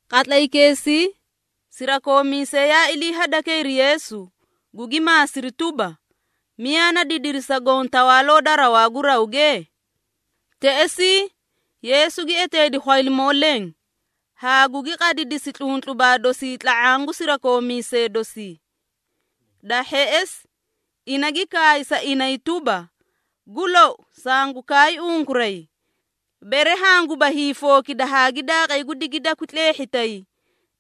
Qatlaykeesii, sirakoomiisee yaa ilii hadakayri Yeesu, gugi maasiri tuba, “Miyaa na didiri sa goõ Tawaaloo da rawaa gu rawge?” Teꞌesii, Yeesu gi eteedi khwaylimoo leẽ, haa gugi qadidisi tluntlubaa dosii tla⁄aã gu sirakoomiisee dosii. Da hheꞌesi, ina gi kaay sa inay tuba, “Gu lou sangu kaay unkuray, bere hanguba hiifookida haa gi daaqay gu digidakwi tleehhitay,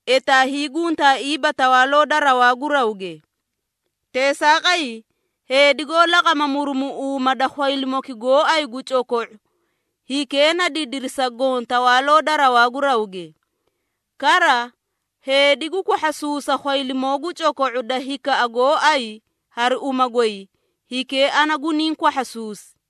etaa hiiguntaaiiba Tawaaloo da rawaa gu rawge. Teesaaqay, heedi goó laqama murumuꞌuuma da khwaylimoki gooay gu coko⁄u, hikee na didiri sa goõ Tawaaloo da rawaa gu rawge. Kara, heedi gu kwahhasuusa khwaylimoo gu coko⁄u da hinkaa gooay hari uma goy, hikee ana guniĩ kwahhasuusi.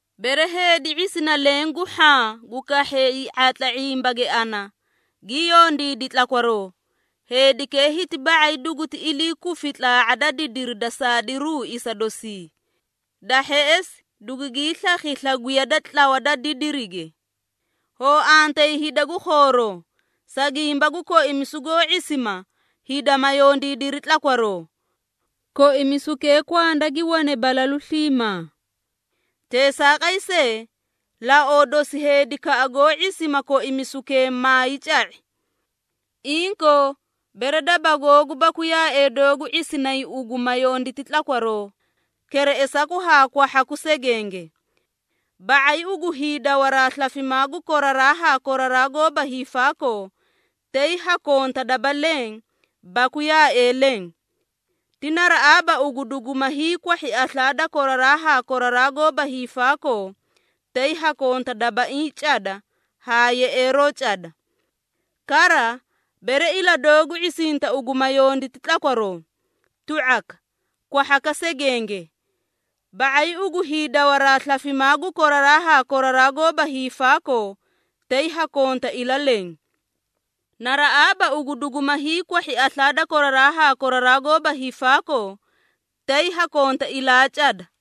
Bere heedi ⁄isina leẽ gu hhaã gu kahhee hii⁄atla ⁄imbage ana gi yondiidi tlakwaroo, heedikee hiti ba⁄ay duguti ilii kufi tlaa⁄a da didiri da saadiruu isa dosii. Da hheꞌesi dugugii slakhi slagwiya da tlawa da didirige. Hoo antayi hida gu khooroo, sa gimba gu koimisu goó ⁄isima, hida ma yondiidiri tlakwaroo! Koimisukee kwanda gi wane balalu sliimaa. Teesaaqay see, laoo dosi heedikaꞌa goó ⁄isima koimisukee maay ca⁄i. Inkoo, bere daba googu baku yaaee doogu ⁄isinay ugu ma yonditi tlakwaroo, kereꞌesaku haa kwahhaku segenge. Ba⁄ay ugu hiidawaraa slafimaa gu koraraa haa koraraa goóba hiifaakoo, tay ha konta daba leẽ baku yaaee leẽ. Ti naraꞌaaba ugu duguma hiikwahhi aslaa da koraraa haa koraraa goóba hiifaakoo, tay ha konta dabaiĩ cada haa yeꞌeeroo cada. Kara, bere ila doogu ⁄isinta ugu ma yonditi tlakwaroo, tu⁄aka, kwahhaka segenge. Ba⁄ay ugu hiidawaraa slafimaa gu koraraa haa koraraa goóba hiifaakoo, tay ha konta ila leẽ. Naraꞌaaba ugu duguma hiikwahhi aslaa da koraraa haa koraraa goóba hiifaakoo, tay ha konta ilaa cada.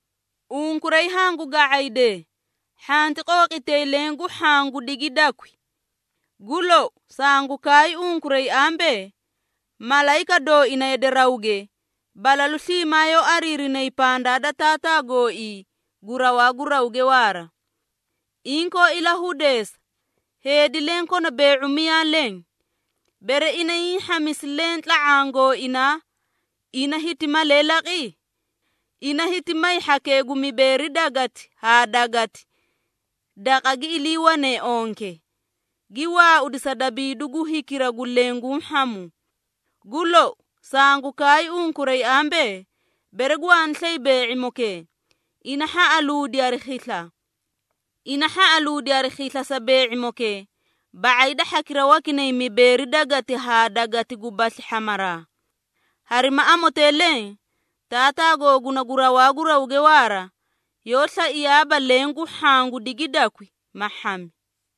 Unkuray hangu ga⁄aydee, hhanti qooqitay leẽ gu hhaã gu digidakwi. Gu lou, sangu kaay unkuray ambee, malayika dooina yade rawge, balalu sliimaa yoó ariirinayi pandaa da Taataa gooii gu rawaa gu rawge waara. Inkoo ilahudeesa, heedi leẽ kona bee⁄u miyaa leẽ. Bere ina hiĩ hhamisi leẽ tla⁄aã gooinaa, ina hiti malee laqi? Ina hiti may hhakee gu mibeeri gweleti haa gweleti daqa gi iliiwanee onke, gi waaudi sa dabiidu gu hikira gu leẽ guũ hhamu. Gu lou, sangu kaay unkuray ambee, bere gwaani slay bee⁄imokee, ina hhaꞌaluudi hari khisla. Ina hhaꞌaluudi hari khisla sa bee⁄imokee, ba⁄ay da hhakira wakinay mibeeri gweleti haa gweleti gubasli hhamaraa. Harima amotee leẽ, Taataa googuna gu rawaa gu rawge waara, yoó slaiyaaba leẽ gu hhaã gu digidakwi, ma hhami.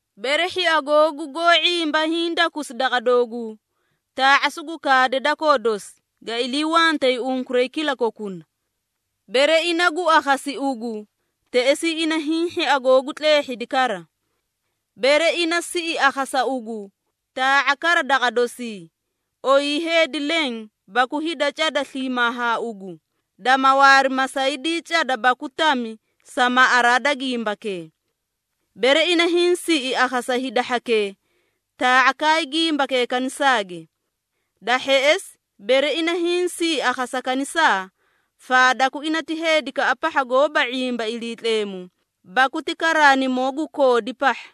Bere hhia googu goó ⁄imba, hiidakusi daqa dooguu, taa⁄a sugu kaade dakoo dosi, ga iliiwantee unkuray kilakokuna. Bere ina gu akhasi ugu, teꞌesii ina hiĩ hhia googu tleehhidi kara. Bere ina siꞌi akhasa ugu, taa⁄a kara daqa dosii, oyii heedi leẽ baku hida cada sliimaa haa ugu, dama waari masaydii cada baku tami sa maꞌaraa da gimbakee. Bere ina hiĩ siꞌi akhasa hida hhakee, taa⁄a kaay gimbakee kanisaage. Da hheꞌesi, bere ina hiĩ siꞌi akhasa kanisaa, faadaku ina ti heedikaꞌa pahha goóba ⁄imba Iliitleemu, baku ti karaanimoo gu koodi pahha.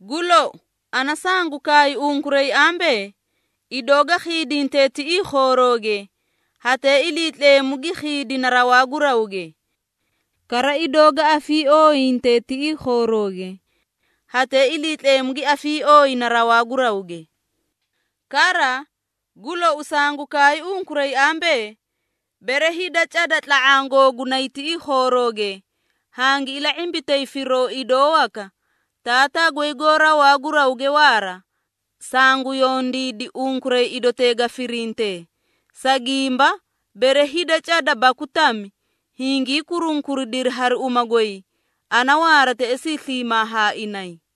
Gu lou, ana sangu kaay unkuray ambee, idoo ga khiidinte tiꞌii khoorooge, hatee Iliitleemu gi khiidina rawaa gu rawge. Kara idoo ga afiiooyinte tiꞌii khoorooge, hatee Iliitleemu gi afiiooyina rawaa gu rawge. Kara, gu lou sangu kaay unkuray ambee, bere hida cada tla⁄aã googunay tiꞌii khoorooge, hangi ila⁄imbitay firoo idoo waka, Taataa goy goó rawaa gu rawge waara, sangu yondiidi unkuray, idotee ga firintee. Sa gimba, bere hida cada baku tami, hingii kurunkuridiri hari uma goy, ana waara teꞌesii sliimaa haa inay.”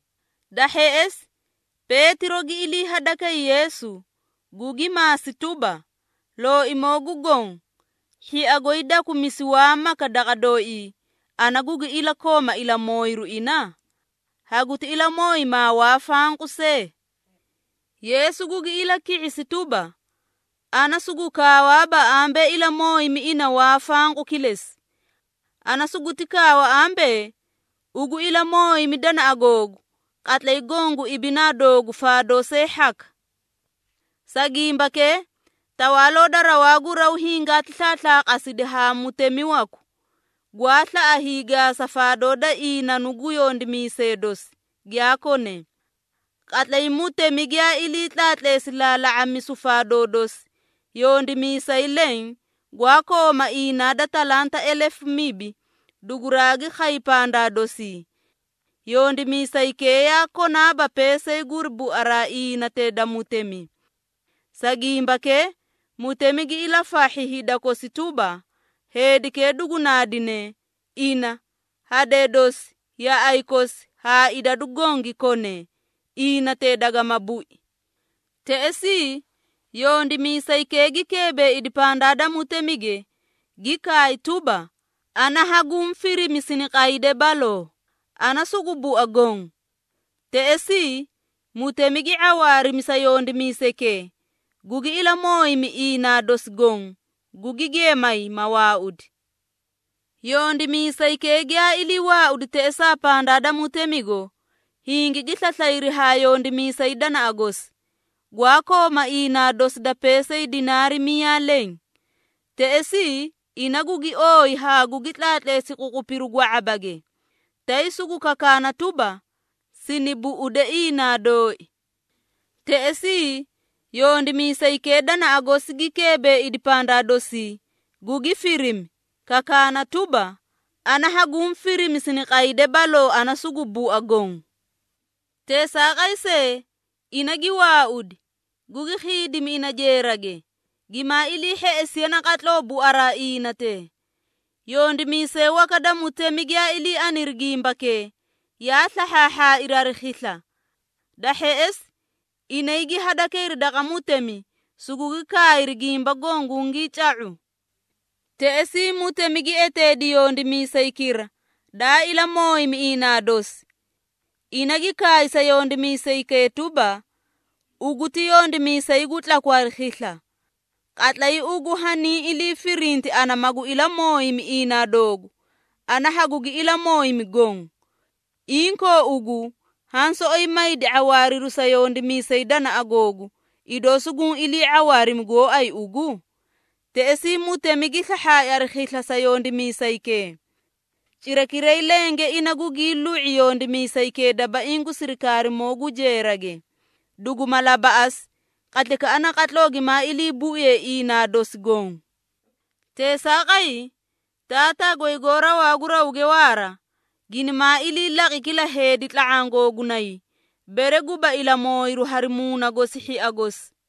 Da hheꞌesi, Peetiro gi ilii hadakay Yeesu, gugi maasi tuba, “Looimoo gu Goõ, hhia goy dakumisi waa maka daqa dooii, ana gugi ilakooma ilamooyiru ina? Haguti ilamooyimaa waa fanqu see?” Yeesu gugi ilaki⁄isi tuba, “Ana sugu kaawaaba ambee ilamooyimi ina waa fanqu kilesi. Ana suguti kaawa ambee, ugu ilamooyimi danaꞌa googu, qatlay goõ gu ibinaa doogu faadoo see hhaka. Sa gimbakee, Tawaaloo da rawaa gu raw hingaati slaaslaqasidi haa mutemi waku, gwaa slaꞌa hiigaasa faadoo da iinanu gu yondimiisee dosi, giyaa konee. Qatlay mutemi giyaa ilii tlaatleesi laala⁄amisu faadoo dosi, yondimiisay leẽ, gwaa kooma inaa da talanta elefu mibi, duguraagi khay pandaa dosii. Yondimiisaykee yaa konaaba peesay guri buaraa iinatee da mutemi. Sa gimbakee, mutemi gi ilafahhi hida kosi tuba, heedikee dugu naadine, ina, hadee dosi, yaꞌay kosi haa idadu goõ gi kone, iinatee dagama bui. Teꞌesii, yondimiisaykee gi keebeeidi pandaa da mutemige, gi kaay tuba, ‘Ana hanguũ firimi siniqayde baloo, ana sugu bua goõ.’ Teꞌesii, mutemi gi ⁄awaarimi sa yondimiisaykee, gugi ilamooyimi iinaa dosi goõ, gugi geemay, ma waaudi. Yondimiisaykee giyaa ilii waaudi teꞌesaa pandaa da mutemigo, hingigi slaslayri haa yondimiisay danaꞌa gosi, gwaa kooma iinaa dosi da peesay dinaari miyaa leẽ. Teꞌesii, ina gugi ooyi haa gugi tlaatleesi ququpiru gwa⁄abage, tay sugu kakaana tuba, ‘Sini buꞌude iinaa dooi.’ Teꞌesii, yondimiisaykee danaꞌa gosi gi keebeeidi pandaa dosii, gugi firimi, kakaana tuba, ‘Ana hanguũ firimi siniqayde baloo ana sugu bua goõ.’ Teesaaqay see, ina gi waaudi, gugi khiidimi ina jeerage, gimaa ilii hheꞌesiye naqatloo buaraa iinatee. Yondimiisee waka da mutemi, giyaa ilii aniri gimbakee, yaa slahhaahhaairi hari khisla. Da hheꞌesi, inay gi hadakayri daqa mutemi, sugugi kaayri gimba goõ gungii ca⁄u. Teꞌesii, mutemi gi eteedi yondimiisaykira, daa ilamooyimi iinaa dosi. Ina gi kaay sa yondimiisaykee tuba, ‘Ugu ti yondimiisay gu tlaku hari khisla. Qatlay ugu haniĩ ilii firinti ana magu ilamooyimi iinaa doogu, ana hagugi ilamooyimi goõ. Inkoo ugu, haã soꞌoyi maydi ⁄awaariru sa yondimiisay danaꞌa googu, idoo suguũ ilii ⁄awaarimi gooay ugu?’ Teꞌesii mutemi gi slahhaai hari khisla sa yondimiisaykee. Cirakiray lenge ina gugii lu⁄i yondimiisaykee dabaiĩ gu sirikaarimoo gu jeerage, duguma labaꞌasi, qatlaykaꞌa naqatloo gimaa iliibuiye iinaa dosi goõ. Teesaaqay, Taataa goy goó rawaa gu rawge waara, ginimaa ilii laqi kila heedi tla⁄aã googunay, bere guba ilamooyiru hari muuna gosi hhia gosi.”